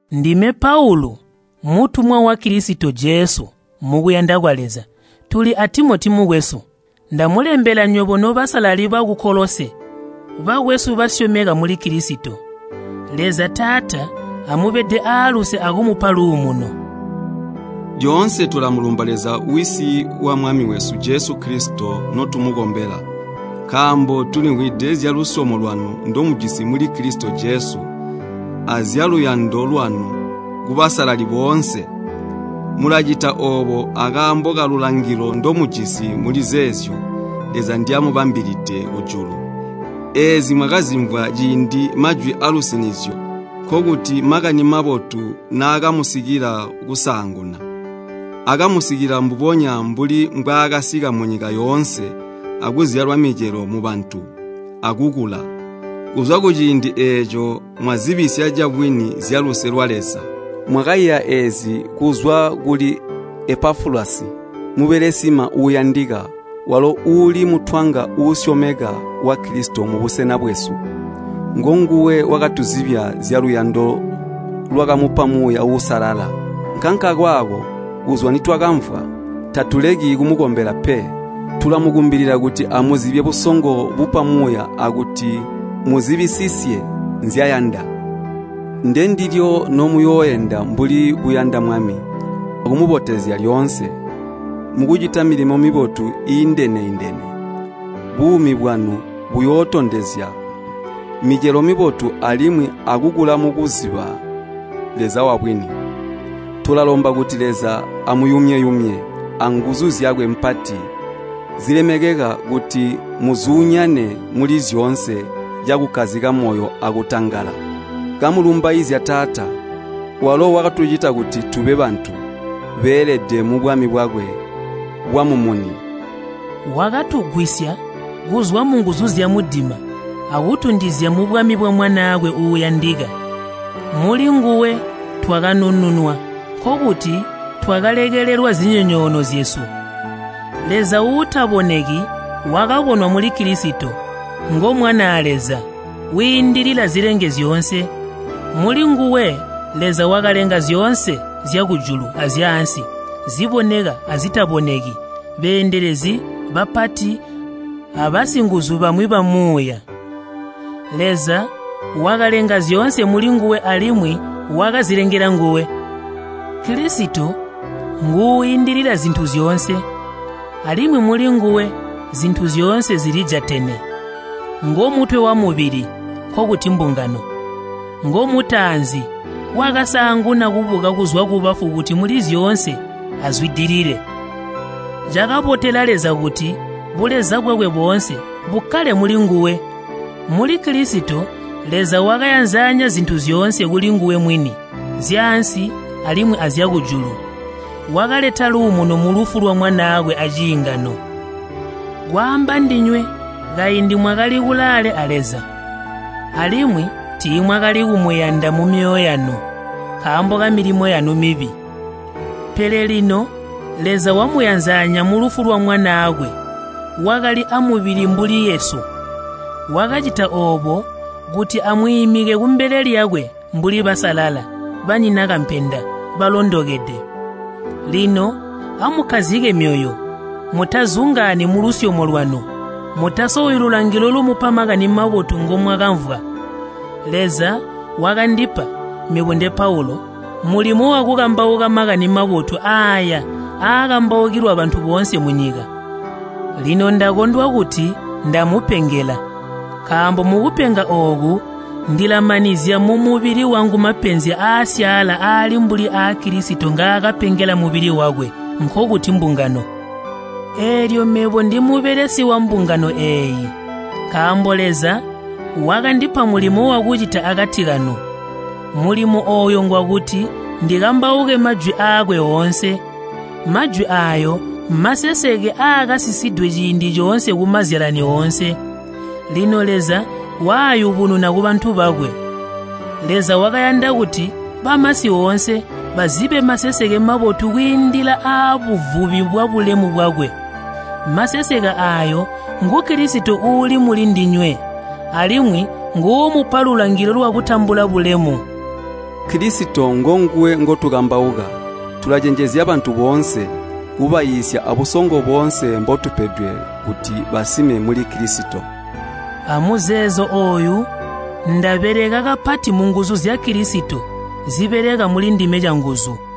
Ndime Paulu mutumwa wa Kilisito Jesu mukuyanda kwa Leza, tuli a Timoti mukwesu. Ndamulembela nywebo nobasalali baku Kolose bakwesu basyomeka muli Kilisito. Leza Taata amubede aaluse akumupa luumuno. Lyoonse tulamulumba Leza Wisi wa Mwami wesu Jesu Kilisito notumukombela. Nkaambo tulimvwide zyalusyomo lwanu ndomujisi muli Kilisito Jesu, azyaluyando lwanu kubasalali boonse. Mulacita oobo akaambo kalulangilo ndomujisi mulizeezyo Leza nzyamubambilide kujulu. Eezi mwakazimvwa ciindi majwi aalusinizyo, nkokuti Makani Mabotu naakamusikila kusaanguna. Akamusikila mbubonya mbuli mbwaakasika munyika yoonse, akuzyala micelo mubantu, akukula. Kuzwa ciindi eeco mwazibisya cabwini zyaluse lwa Leza. Mwakaiya eezi kuzwa kuli Epafulasi mubelesima uuyandika, walo uuli mutwanga uusyomeka wa Kilisito mubusena bwesu. Ngonguwe wakatuzibya zyaluyando lwakamupa Muuya Uusalala. Nkankakaako, kuzwa nitwakamvwa, tatuleki kumukombela pe. Tulamukumbilila kuti muzibye busongo bupa Muuya akuti muzibisisye nzyayanda. Ndendilyo nomuyooenda mbuli buyanda Mwami, akumubotezya lyoonse. Mukucita milimo mibotu iiindene-indene, buumi bwanu buyootondezya micelo mibotu alimwi akukula mukuziba Leza wabwini. Tulalomba kuti Leza amuyumye-yumye anguzu zyakwe mpati zilemekeka kuti muzuunyane muli zyoonse cakukkazika moyo akutangala. Kamulumbaizya Taata, walo wakatucita kuti tube bantu beelede mubwami bwakwe bwamumuni. Wakatugwisya kuzwa munguzu zyamudima akutunjizya mubwami bwa Mwanaakwe uuyandika. Mulinguwe twakanununwa nkokuti twakalekelelwa zinyonyoono zyesu. Leza uutaboneki wakabonwa muli Kilisito. Ngo Mwanaa Leza, wiindilila zilenge zyoonse. Mulinguwe Leza wakalenga zyoonse zyakujulu azyaansi, ziboneka azitaboneki, beendelezi, bapati, abasinguzu bamwi bamuuya. Leza wakalenga zyoonse mulinguwe alimwi wakazilengela nguwe. Kilisito nguuindilila zintu zyoonse, alimwi mulinguwe zintu zyoonse zilijatene. Ngomutwe wamubili, nkokuti mbungano. Ngomutaanzi, wakasaanguna kubuka kuzwa kubafu kuti muli zyoonse azwidilile. Cakabotela Leza kuti buleza bwakwe boonse bukkale mulinguwe. Muli Kilisito Leza wakayanzanya zintu zyoonse kulinguwe mwini, zyaansi alimwi azyakujulu. Wakaleta luumuno mulufu lwa Mwanaakwe aciingano. Kwaamba ndinywe kaindi mwakali kulaale a Leza, alimwi tiimwakali kumuyanda mumyoyo yanu, nkaambo kamilimo yanu mibi. Pele lino Leza wamuyanzanya mulufu lwa Mwanaakwe wakali amubili mbuli yesu. Wakacita oobo kuti amwiimike kumbele lyakwe mbuli basalala, banyina kampenda, balondokede. Lino amukkazike myoyo, mutazungaani mulusyomo lwanu, mutasowi lulangilo lumupa Makani Mabotu ngomwakamvwa. Leza wakandipa, mebo nde Paulu, mulimo wakukambauka Makani Mabotu aaya aakambaukilwa bantu boonse munyika. Lino ndakondwa kuti ndamupengela nkaambo mukupenga ooku ndilamanizya mumubili wangu mapenzi aasyaala aali mbuli aa Kilisito ngaakapengela mubili wakwe, nkokuti mbungano. Eelyo mebo ndimubelesi wambungano eeyi, nkaambo Leza wakandipa mulimo wakucita akati kanu. Mulimo ooyo ngwakuti ndikambauke majwi aakwe oonse. Majwi aayo mmaseseke aakasisidwe ciindi coonse kumazyalani oonse, lino Leza waayubununa kubantu bakwe. Leza wakayanda kuti bamasi oonse bazibe maseseke mabotu kwiindilila aabuvubi bwabulemu bwakwe. Maseseke aayo ngu Kilisito uuli muli ndinywe, alimwi nguumupa lulangilo lwakutambula bulemu. Kilisito ngonguwe ngotukambauka. Tulacenjezya bantu boonse, kubaiisya abusongo boonse mbotupedwe kuti basime muli Kilisito. Amuzeezo ooyu ndabeleka kapati munguzu zya Kilisito zibeleka mulindime canguzu.